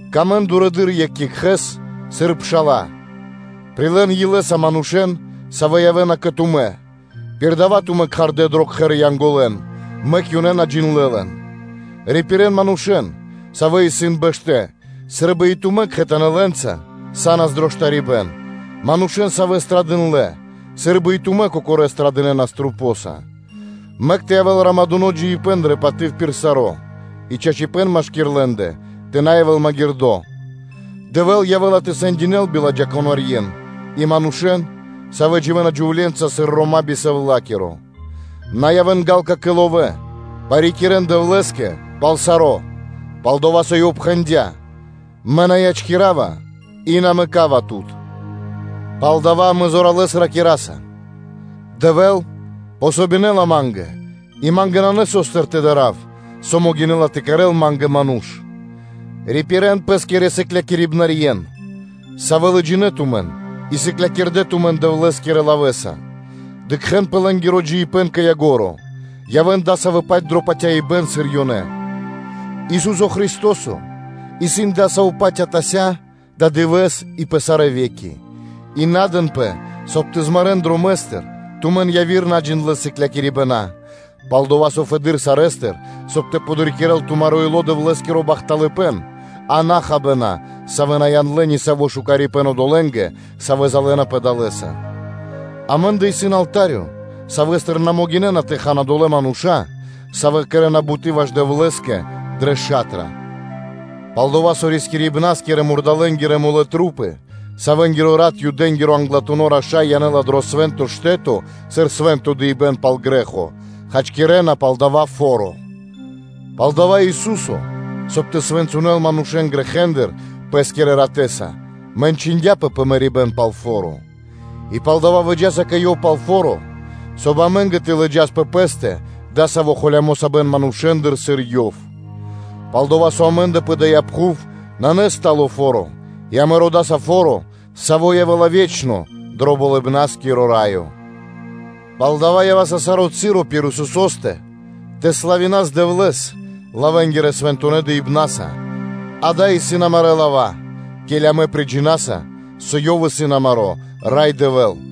Сыкавэ́н паты́в дурэды́р екх екхэ́скэ, сыр пша́ла. Прилэ́н илэ́са манушэ́н, савэ́ явэ́на кэ тумэ́, пир дава́ тумэ́ кхардэ́ дро кхэр Янголэн, мэк ёнэ на джиндлэ́ лэн. Рипирэн манушэ́н, савэ́ ханэ мэньки, сы́рбы и тумэ́ кхэтанэ́ лэ́нца са́нас дро штарибэ́н; манушэ́н, савэ́ страдындлэ, сы́рбы и тумэ́ кокорэ́ страдынэнас масэнца. Мэк тэ явэ́л романдуно́ (супру́жэско) джиибэ́н дрэ паты́в пир саро́, и чачипэ́н машки́р лэ́ндэ тэ на явэ́л магирдо́; Дэвэ́л явэ́ла тэ сэндякирэ́л биладжакунэ́ манушэ́н и манушэ́н, савэ́ дживэ́на джувле́нца сыр рома́ би совлакиро. На явэ́н ґа́лка (жадна) кэ ловэ́, парикирэ́н Дэвлэ́скэ пал саро́, пал-дова́ со Ёв пхэндя́: “Мэ на ячкирава и на мэкава тут.” Палдава́ амэ зоралэ́с ракираса: “Дэвэ́л помогинэла ма́нгэ, и ма́нгэ нанэ со́стыр тэ дарав, со могинэ́ла тэ кэрэ́л ма́нгэ ману́ш?” Рипирэн пэ́скирэ сыклякирибнарьен (наставникэн), савэ́ лыджинэ́ тумэн и сыклякирдэ́ тумэн Дэвлэ́скирэ лавэ́скэ, дыкхэ́н пэ лэ́нгиро джиибэ́н кэ ко́нцо (кэ яго́ро); явэ́н дасавэ́-паць дро патяибэ́н, сыр ёнэ исын. Ису́со Христо́со исын Адасаво́-паць атася́, ададывэ́с и пэ сарэ́ ве́ки. И на дэнпэ, соб (кай) яви́р наджиндлэ сыклякирибэна тэ змарэн дромэ́стыр тумэн, пал-дова́ со фэды́р сарэ́стыр, соб (кай) тэ подрикирэ́л тумаро́ ило́ Дэвлэ́скиро бахталыпэ́н, а на хабэна, савэ́ на яндлэ́ нисаво́ шукарипэ́н одолэ́нгэ, савэ́ залэнапэ далэ́са. Амэ́ндэ исын алта́рё, савэ́стыр на могинэ́на тэ хан одолэ́ мануша́, савэ́ кэрэ́на буты́ ваш Дэвлэ́скэ дрэ ша́тра; пал-дова́ со рискирибна́скирэ-мурдалэнгирэ тру́пы, савэнгиро рат Англатуно́ Юдэ́нгиро Раша́й янэ́ла дро Свэ́нто Штэ́то сыр свэ́нто дыибэ́н пал грэ́хо, хачкирэна пал дава́ ста́но (лод), палдава́ и Ису́со, соб (кай) тэ свэнцынэл манушэ́н грэхэ́ндыр Пэ́скирэ ратэ́са, мэнчындяпэ пэ мэрибэ́н пал фо́ро: и палдава́ выджаса кэ Ёв пал фо́ро, соб (кай) и амэ́нгэ тэ лыджас пэ пэ́стэ дасаво холямо́ сабэн манушэ́ндыр, сыр Ёв: пал-дова́ со амэ́ндэ пэ дая́ пхув нанэ стало фо́ро, и амэ родаса фо́ро, саво́ явэ́ла ве́чно дро Болыбна́скиро Раё. Палдава́ ява́са саро́ часо пир Исусо́стэ тэ славинас Дэвлэ́с лавэ́нгирэ-свэнтонэ́ дыибнаса, – дава́ исын амарэ́ лава́, ке́ли амэ приджинаса, со Ёв исын амаро́ Рай Дэвэ́л.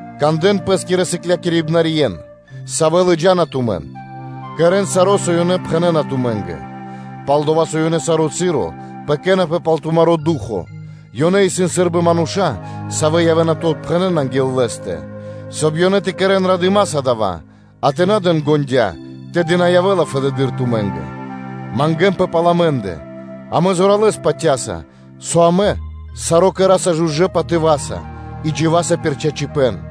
Кандэ́н пэ́скирэ сыклякирибнарьен, савэ́ лыджа́на тумэн, кэрэ́н саро́, со ёнэ пхэнэ́на тумэ́нгэ; пал-дова́ со ёнэ саро́ часо пэкэнапэ (заботисона) пал тумаро́ ду́хо (фа́но), ёнэ исын сы́рбы мануша́, савэ́ явэ́на тэ отпхэнэн анги́л Лэ́стэ, соб (кай) ёнэ тэ кэрэ́н радыма́са дава́, а на тэ дэн ґондя́ (на тэ ўздыхинэн), тэды на явэ́ла фэдэды́р тумэ́нгэ. Мангэ́нпэ пал амэ́ндэ: амэ зоралэ́с патя́са, со амэ саро́ кэра́са жужэ́ патыва́са и дживаса пир чачипэ́н.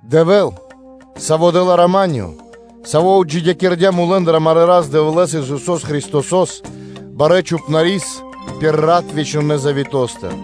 Дэвэ́л, Саво́ дэ́ла рама́нё (миро), Саво́ отджидякирдя́ мулэ́ндыр амарэ́ Рас-Дэвлэ́с, Исусо́с Христосо́с, Барэ́ Чхупнарис пир рат вечнонэ Заветостыр,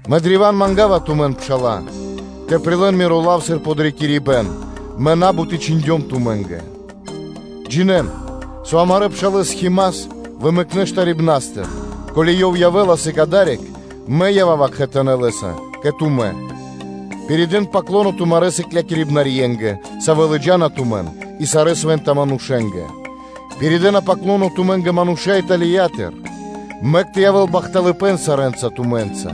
Мэ древа́н манга́ва тумэн, пшала́лэ, тэ прилэ́н миро лав сыр подрикирибэ́н, мэ на́бут и чхиндём тумэ́нгэ. Джинэ́н, со амарэ́ пшалэ́с Хима́с вымэкнэ штарибнастыр; ко́ли ёв явэ́ла сыг адари́к, мэ ява́ва кхэтанэ́ лэ́са кэ тумэ́. Пиридэ́н “паклоно” тумарэ́ сыклякирибнарьенгэ, савэ́ лыджа́на тумэн, и сарэ́ свэнтонэ́ манушэ́нгэ. Пиридэна “паклоно” тумэ́нгэ мануша́ Италиятыр. Мэк тэ явэ́л бахталыпэ́н сарэ́нца тумэ́нца.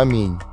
Ами́нь.